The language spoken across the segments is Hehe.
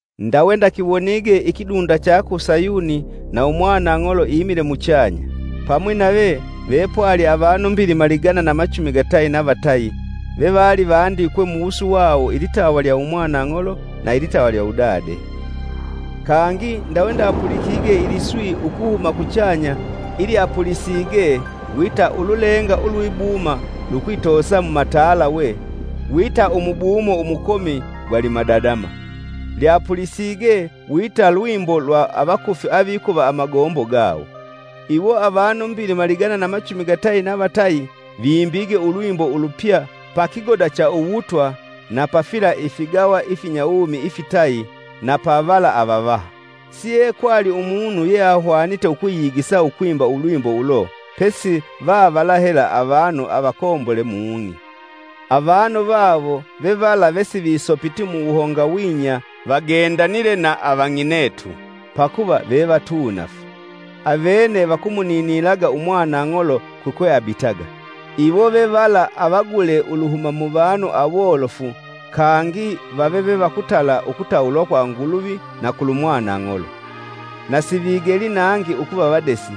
Ndawe ndakiwonige ikidunda cha ku Sayuni, na umwanang'olo imile muchanya; pamwi nave vepwali avanu mbilima ligana na machumi gatayi na vatayi ve valivandikwe muwusu wawo ilitawa lya Umwanang'olo na ilitawa lya Udade. Kangi ndawe ndapulikige iliswi ukuhuma kuchanya ilyapulisige wita ululenga ulwibuma lukwitoosa mumatalawe, wita umubumo umukomi gwa limadadama. Lyapulisige wita lwimbo lwa avakufi avikuva amagombo gawo. Iwo avanu mbilima ligana na machumi gatayi na vatayi vimbige ulwimbo ulupya pa kigoda cha uwutwa na pa fila ifigawa ifinyawumi ifitayi na pa vala avavaha. Siekwali umunu yeahwanite ukwiyigisa ukwimba ulwimbo ulo pesi vavala hela avanu avakombole mung'i. Avanu vawo, vevala vesivisopiti muwuhongawinya vagendanile na avang'inetu, pakuva veva tunaafu. Avene, vakumuninilaga Umwanang'olo kukwe abitaga. Iwo vevala avagule uluhuma muvanu awolofu, kangi vave ve va ukutala ukutawulwa kwa Nguluvi na kulumwanang'olo. Na sivigeli nangi ukuva vadesi;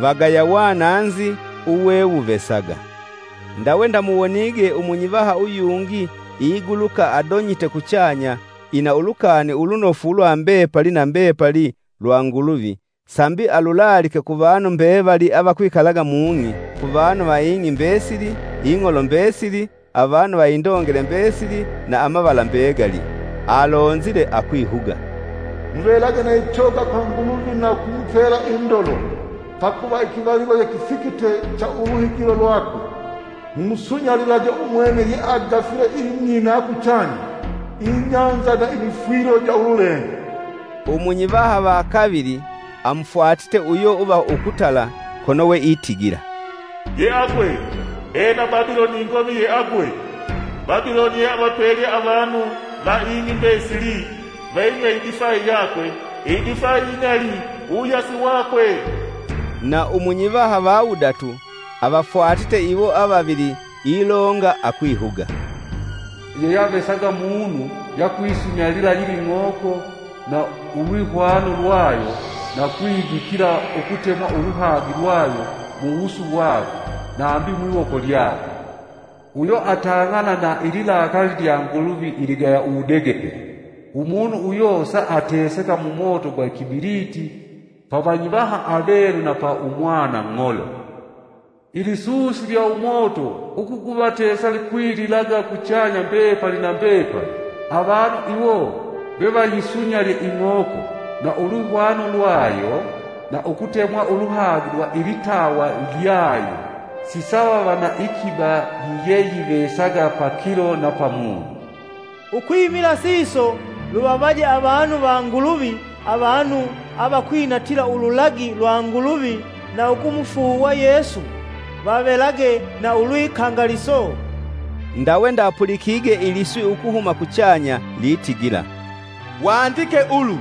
vagaya wananzi uwewuvesaga. Ndawe ndamuwonige Umunyivaha uyungi iguluka adonyite kuchanya ina Ulukani Ulunofu lwa mbepali na mbepali lwa Nguluvi sambi alulalike ku vanu mbevali avakwikalaga mung'i ku vanu va ing'i mbesili, ing'olo mbesili, avanu va indongele mbesili na amavala mbegali. Alonzile akwihuga, “Muvelage na ichoga kwa Nguluvi na ukumupela indolo! Pakuva ikivalilo yekifikite cha uluhigilo lwakwe. Mumusunyalilage umwene yeagafile ing'i na kuchanya, ibahali na imifwilo ja ululenga.” Umunyivaha va kavili amufwatite uyo uva ukutala kono weitigila, “Yeagwe! Ena Babiloni ingomi yeagwe! Babiloni yeavapelye avanu va ing'i mbesili vayinywe idifayi yakwe idifai ing'ali uwuyasi wakwe.” Na umunyivaha va wudatu avafwatite iwo avavili ilonga akwihuga, “Yeyeavesaga munu yeakuyisunyalila yila ing'oko na ulwihwana lwayo na ukwidikila ukutemwa uluhagi lwayo muwusu wakwe nambi mwiwoko lyakwe, uyo atang'anila ilikali lya Nguluvi iligaya uwudegepele. Umunu uyo sa ateseka mumoto gwa ikibiliti pa Vanyivaha avelu na pa Umwanang'olo. Ilisusi lya umoto ugukuvatesa likwililaga kuchanya mbepali na mbepali. Avanu iwo vevayisunyalye ing'oko na ulwihwano lwayo, na ukutemwa uluhagi lwa ilitawa lyayo, sisavava na iikiba yiyeyivesaga pakilo na pamunyi.” Ukwimila siso, luvavaje avanu va Nguluvi, avanu avakwinatila ululagi lwa Nguluvi na ukumufuuwa Yesu, vavelage na ulwikangaliso. Ndawe ndapulikige iliswi ukuhuma kuchanya litigila, “Wandike ulu!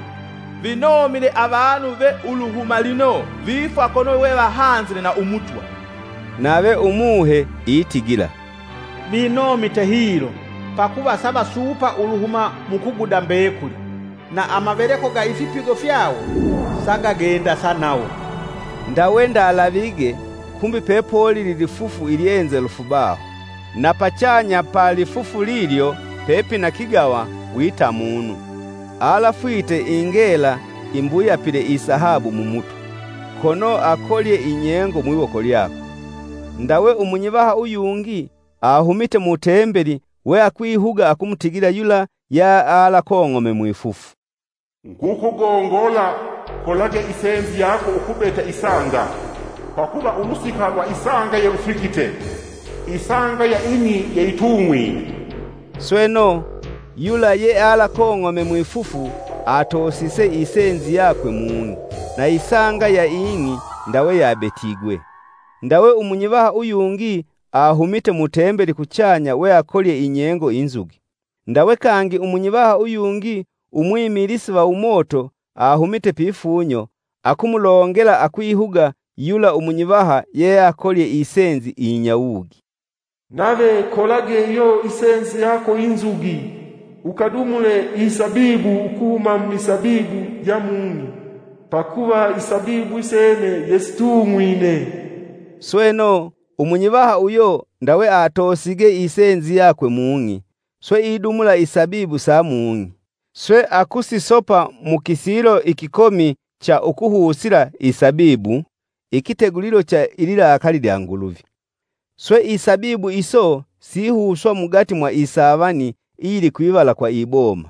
Vinomile avanu ve uluhuma lino vifwa kono wevahanzile na Umutwa.” Nave Umuhe itigila, “Vinomite hilo! Pakuva savasuupa uluhuma mu kuguda mbekuli; na amaveleko ga ifipigo fyawo sagagendasa nawo.” Ndawe ndalavige, kumbi pepolili lifufu ilyenzelufu baho. Na pachanga pa lifufu lilyo pepina kigawa wita munu. Alafwite ingela imbuyapile isahabu mumutwe, kono akolye inyengo mwiwoko lyakwe. Ndawe umunyivaha uyungi ahumite mu Tembeli weakwihuga akumutigila yula yealakong'ome mwifufu, “Ngukugongola, kolage isenzi yako ukabete isanga, pakuva ulusika lwa isanga yelufikite; isanga ya ing'i yeyitung'wine.” Sweno, yula yealakong'ome mwifufu atoosise isenzi yakwe mung'i, na isanga ya ing'i ndawe yabetigwe. Ndawe umunyivaha uyungi ahumite mu Tembeli kuchanya weakolye inyengo inzugi. Ndawe kangi umunyivaha uyungi umwimilisi va umoto, ahumite pifunyo, akumulongela akwihuga yula umunyivaha yeakolye isenzi iyinyawugi, “Nave kolage iyo isenzi yako inzugi, ukadumule isabibu ukuhuma mumisabibu ja mung'i pakuva isabibu isene yesitung'wine!” Sweno, umunyivaha uyo ndawe atoosige isenzi yakwe mung'i, swe idumula isabibu sa mung'i, swe akusisopa mu kisilo ikikomi cha ukuhusila isabibu, ikitegulilo cha ililakali lya Nguluvi. Swe isabibu iso sihuswa mugati mwa isavani iyili kwivala kwa iboma,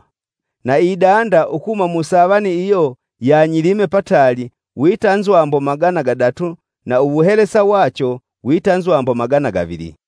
na idanda ukuhuma musavani iyo yanyilime pataali wita nzwambo magana gadatu na uwuhelesa wacho wita nzwambo magana givili.